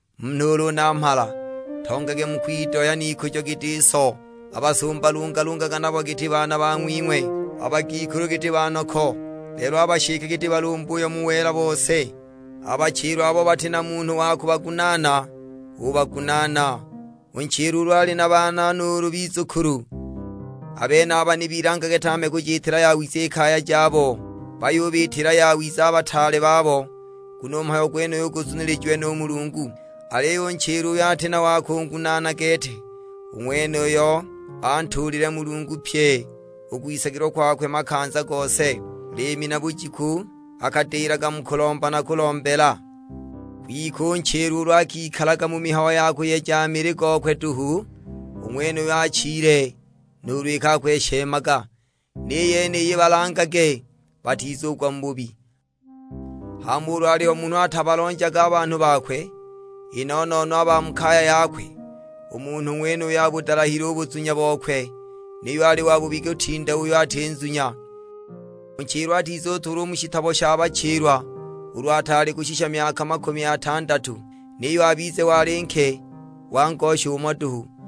U munhu ulu namhala, ntongage mu kwidohya n'ikujo giti so. A basumba lungalungaga nabo giti baana bang'wing'we. A bagikulu giti banoko, lelo a bashike giti balumbuyo mu wela bose. A bachilwa abo bati na munhu wa kubagunaana, ubagunaana. U nchilwa ulu ali na baana nuulu bizukulu, a benaba ni bilangage tame kujiitila yawiza i kaya jabo, bayubiitila yawiza a bataale babo, nguno u mhayo gwenuyu guzunilijiwe nu Mulungu. Aliyo u nchilwa uyo ati na wa kungunaana gete, u ng'wenuyo antuulilile Mulungu pyi u kwisagilwa kwakwe makanza gose; liimi na bujiku akadilaga mu kulomba na kulombela. Kwike u nchilwa ulu akikalaga mu mihayo ya kuyeja mili gokwe duhu, u ng'wenuyo achile nuulu iki akweshemaga! Ni yeniyi balangage, batizugwa mu bubi. Hama ulu aliho munhu atabalonjaga a banhu bakwe, i no-no-no a ba mu kaya yakwe, u munhu ng'wenuyo abudalahile u buzunya bokwe, niyo ali wabubi kutinda uyo ati nzunya. U nchilwa atizutuulwa u mu shitabo sha bachilwa ulu ataali kushisha myaka makumi atandatu, niyo abize wali nke wa ngosha umo duhu.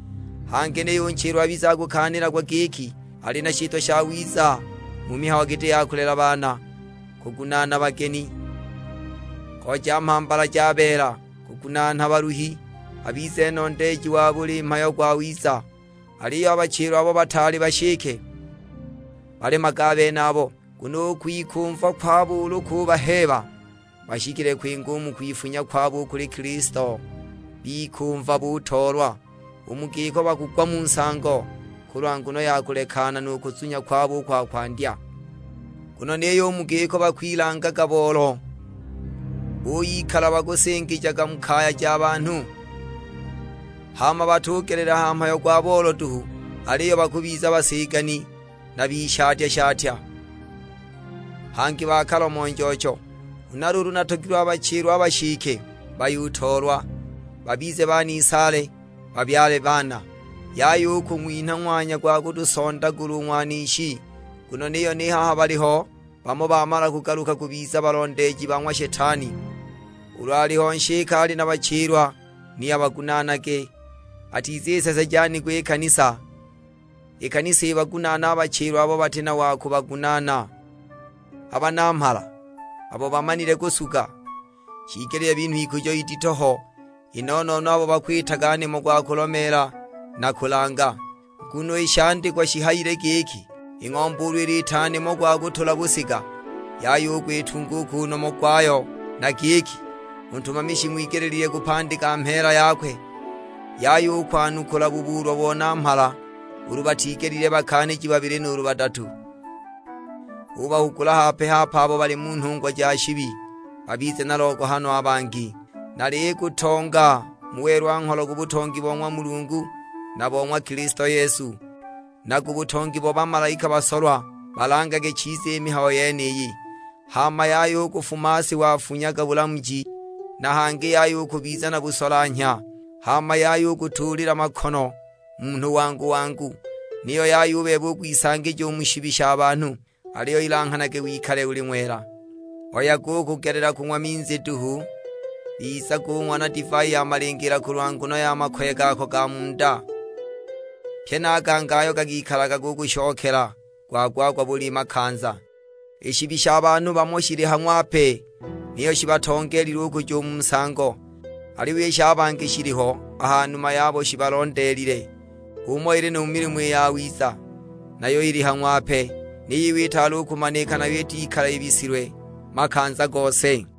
Hangi niyo u nchilwa abize akukaanilagwa giki ali na shitwa shawiza mu mihayo giti ya kulela baana, kugunaana bageni, kooja mhambala ja beela, kugunaana baluhi; abize nondeeji wa buli mhayo gwawiza. Aliyo a bachilwa abo bataali bashike, balemage a benabo; nguno u kwikumva kwabo ulu kubaheeba bashikile kwinga u mu kwifunya kwabo u kuli Kilisto, bikumva butoolwa. U mu giko bakugwa mu nsango, kulwa nguno ya kulekana nu kuzunya kwabo u kwa kwandya. Nguno niyo u mu giko bakwilanga boolo, buyikala bakusingijaga mu kaya ja banhu. Hama batugelela ha mhayo gwa boolo duhu, aliyo bakubiza basigani na bishatya-shatya, hangi bakalomo-njoocho. Huna luulu natogilwe a bachilwa a bashike bayutoolwa, babize banisaale, babyale baana. Yaya u kung'winha ng'wanya gwa kutusondagula u ng'wanishi. Nguno niyo ni haha baliho bamo bamala kugaluka bubiza balondeeji ba ng'wa Shetani. Ulu aliho nshike ali na bachilwa ni abagunaanage, atiziseseja nigo i kanisa. I kanisa ibagunaane a bachilwa abo bati na wa kubagunaana. A banamhala, abo bamanile kusuga, shiigelile binhwe ikujo idito ho, i no-no-no abo bakwitaga nimo gwa kulomeela na kulanga. Nguno i shandikwa shihayile giki, "I ng'ombe ulu iliita nimo gwa kutula busiga, yaya u kwitunga u ku nomo gwayo." na giki, "U ntumami shing'wigelile kupandika mheela yakwe." Yaya u kwanukula bubuulwa bo namhala, ulu batigelile bakaaniji babili nuulu badatu. Ubahugula hape-hape abo bali mu nhungwa ja shibi, babize na logohano a bangi. Nalikutonga mu welwa-ngholo ku butongi bo ng'wa Mulungu na bo ng'wa Kilisto Yesu, na ku butongi bo bamalaika basolwa; balangage chiza i mihayo yeniyi, hama yaya u kufumaasi wafunyaga bulamuji, na hangi yaya u kubiza na busolanhya. Hama yaya u kutuulila makono munhu wangu-wangu, niyo yaya u bebe u kwisangija mu shibi sha banhu; aliyo ilanghanage wikale uli ng'wela. Oyaga u kugelela kung'wa minzi duhu, bizagung'wa na divai ya malingiila, kulwa nguno ya makoye gako ga mu nda, pye na a gangi ayo gakikalaga gukushokela gwa-gwa-gwa buli makanza. I shibi sha banhu bamo shili ha ng'wape, niyo shibatongeelile u kuja u mu nsango; aliyo i sha bangi shiliho a ha numa yabo shibalondeelile. H'umo ili nu mu milimo i yawiza, nayo ili ha ng'wape, ni yiyo itaali u kumanika nayo itikala ibisilwe makanza gose.